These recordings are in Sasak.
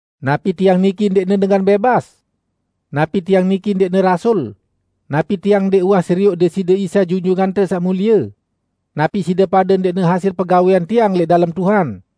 Napi tiang niki ndẽqne dengan bẽbas? Napi tiang niki ndẽqne rasul? Napi tiang ndẽq uwah serioq Deside Isa Junjungante Saq Mulie? Napi side pade ndẽqne hasil pegawẽan tiang lẽq dalem Tuhan?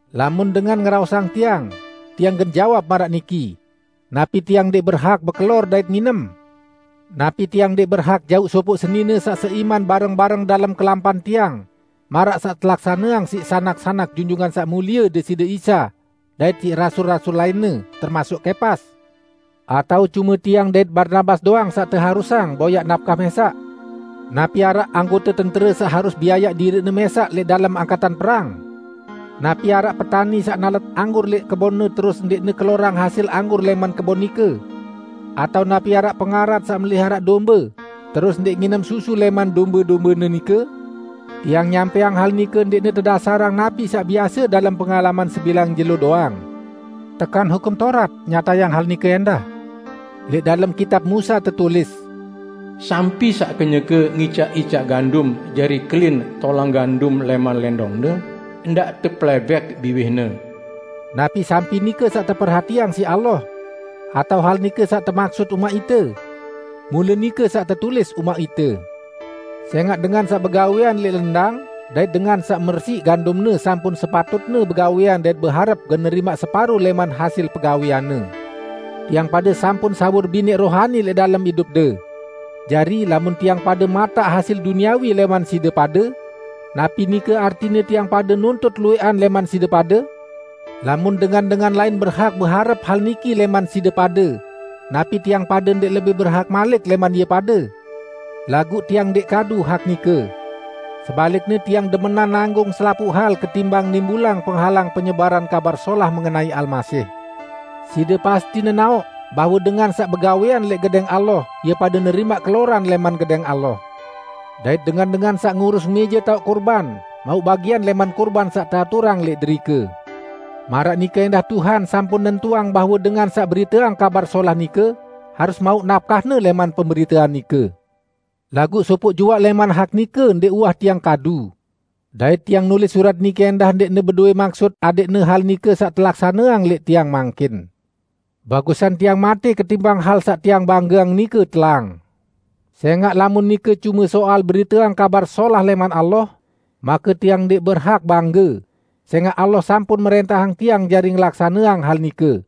Lamun dengan ngeraosang tiang, tiang gen jawab maraq niki: Napi tiang ndẽq berhak bekelor dait nginem? Napi tiang ndẽq berhak jauq sopoq senine saq seiman bareng-bareng dalem kelampan tiang, maraq saq telaksaneang siq sanak-sanak Junjungan Saq Mulie Deside Isa dait siq rasul-rasul lainne, termasuk Kepas? Atao cume tiang dait Barnabas doang saq teharusang boyaq napkah mẽsaq? Napi araq anggote tentere saq harus biayaq diriqne mẽsaq lẽq dalem angkatan perang? Napi araq petani saq nalet anggur lẽq kebonne terus ndẽqne kelorang hasil anggur lẽman kebon nike? Atao napi araq pengarat saq meliharaq dombe, terus ndẽq nginem susu lẽman dombe-dombene nike? Tiang nyampẽang hal nike ndẽqne tedasarang napi saq biase dalem pengalaman sebilang jelo doang, laguq sẽngaq Hukum Taurat nyatayang hal nike ẽndah. Lẽq dalem Kitab Musa tetulis, "Sampi saq kenyeke ngicaq-icaq gandum jari kelin tolang gandum lẽman lẽndongne, ndaq tepelẽbẽk biwihne." Napi sampi nike saq teperhatiang siq Allah? Atao hal nike saq temaksut umaq ite? Mule nike saq tetulis umaq ite. Sẽngaq dengan saq begawẽan lẽq lendang dait dengan saq mersiq gandumne sampun sepatutne begawẽan dait beharep gen nerimaq separo lẽman hasil pegawẽanne. Tiang pade sampun sawur binẽq rohani lẽq dalem idupde. Jari, lamun tiang pade mataq hasil duniawi lẽman side pade, napi nike artine tiang pade nuntut luwẽqan lẽman side pade? Lamun dengan-dengan lain berhak beharep hal niki lẽman side pade, napi tiang pade ndẽq lebih berhak malik lẽman ie pade? Laguq tiang ndẽq kadu hak nike. Sebalikne tiang demenan nanggung selapuq hal ketimbang nimbulang penghalang penyebaran Kabar Solah mengenai Almasih. Side pasti nenaoq bahwe dengan saq begawẽan lẽq Gedẽng Allah ie pade nerimaq keloran lẽman Gedẽng Allah. Dait dengan-dengan saq ngurus mẽje taoq kurban, mauq bagian lẽman kurban saq teaturang lẽq derike. Maraq nike ẽndah Tuhan sampun nentuang bahwe dengan saq beriteang Kabar Solah nike harus mauq napkahne lẽman pemberitean nike. Laguq sopoq juaq lẽman hak nike ndẽq uwah tiang kadu. Dait tiang nulis surat niki ẽndah ndẽqne bedowẽ maksut adẽqne hal nike saq telaksaneang lẽq tiang mangkin. Bagusan tiang matẽ ketimbang hal saq tiang banggeang nike telang. Sẽngaq, lamun nike cume soal beriteang Kabar Solah lẽman Allah, make tiang ndẽq berhak bangge, sẽngaq Allah sampun mrẽntahang tiang jari ngelaksaneang hal nike.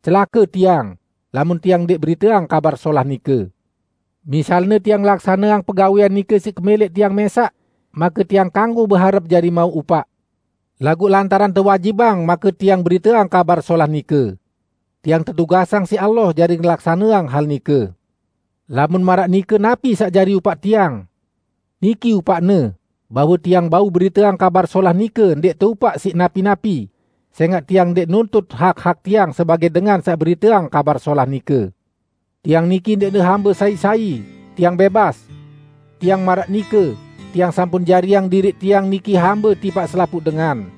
Celake tiang, lamun tiang ndẽq beriteang Kabar Solah nike! Misalne tiang ngelaksaneang pegawẽan nike siq kemẽlẽq tiang mẽsaq, make tiang kanggo beharep jari mauq upaq. Laguq lantaran tewajibang make tiang beriteang Kabar Solah nike. Tiang tetugasang siq Allah jari ngelaksaneang hal nike. Lamun maraq nike, napi saq jari upaq tiang? Niki upaqne: Bahwe tiang bau beriteang Kabar Solah nike ndẽq teupaq siq napi-napi, sẽngaq tiang ndẽq nuntut hak-hak tiang sebagẽ dengan saq beriteang Kabar Solah nike. Tiang niki ndẽqne hambe sai-sai; tiang bẽbas. Timaq maraq nike, tiang sampun jariang diriq tiang niki hambe tipaq selapuq dengan.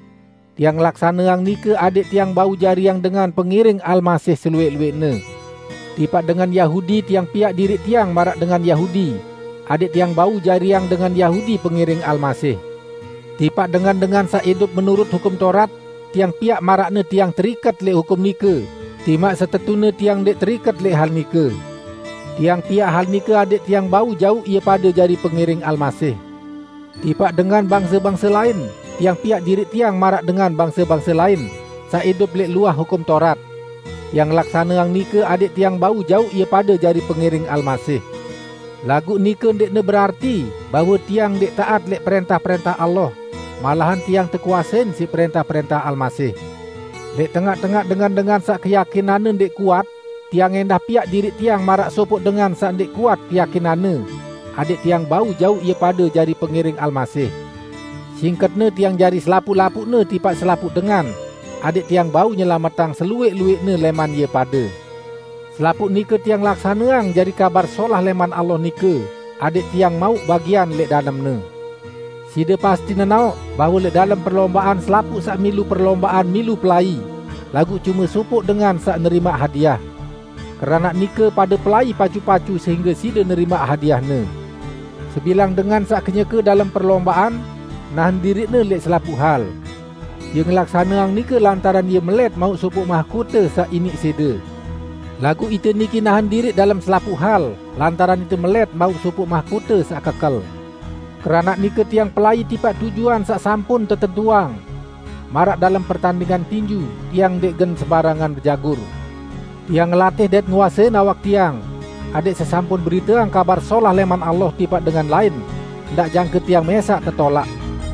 Tiang ngelaksaneang nike adẽq tiang bau jariang dengan pengiring Almasih seluwẽq-luwẽqne. Tipaq dengan Yahudi, tiang piaq diriq tiang maraq dengan Yahudi, adẽq tiang bau jariang dengan Yahudi pengiring Almasih. Tipaq dengan-dengan saq idup menurut Hukum Taurat, tiang piaq maraqne tiang teriket lẽq hukum nike, timaq setetune tiang ndẽq teriket lẽq hal nike. Tiang piaq hal nike adẽq tiang bau jauq ie pade jari pengiring Almasih. Tipaq dengan bangse-bangse lain, tiang piaq diriq tiang maraq dengan bangse-bangse lain, saq idup lẽq luah Hukum Taurat. Tiang ngelaksaneang nike adẽq tiang bau jauq ie pade jari pengiring Almasih. Laguq nike ndẽqne berarti bahwe tiang ndẽq taat lẽq prẽntah-prẽntah Allah; malahan tiang tekuasein siq prẽntah-prẽntah Almasih. Lẽq tengaq-tengaq dengan-dengan saq keyakinanne ndẽq kuat, tiang ẽndah piaq diriq tiang maraq sopoq dengan saq ndẽq kuat keyakinanne, adẽq tiang bau jauq ie pade jari pengiring Almasih. Singketne, tiang jari selapuq-lapuqne tipaq selapuq dengan adẽq tiang bau nyelametang seluwẽq-luwẽqne lẽman ie pade. Selapuq nike tiang laksaneang jari Kabar Solah lẽman Allah nike, adẽq tiang mauq bagian lẽq dalemne. Side pasti nenaoq bahwe lẽq dalem perlombaan selapuq saq milu perlombaan milu pelai, laguq cume sopoq dengan saq nerimaq hadiah. Keranaq nike pade pelai pacu-pacu sehingge side nerimaq hadiahne. Sebilang dengan saq kenyeke dalem perlombaan, nahen diriqne lẽq selapuq hal. Ie ngelaksaneang nike lantaran ie melẽt mauq sopoq mahkote saq iniq sẽde. Laguq ite niki nahen diriq dalem selapuq hal lantaran ite melẽt mauq sopoq mahkote saq kekel. Keranaq nike tiang pelai tipaq tujuan saq sampun tetentuang. Maraq dalem pertandingan tinju, tiang ndẽq gen sembarangan bejagur. Tiang ngelatih dait nguasein awak tiang, adẽq sesampun beriteang Kabar Solah lẽman Allah tipaq dengan lain, ndaq jangke tiang mẽsaq tetolaq.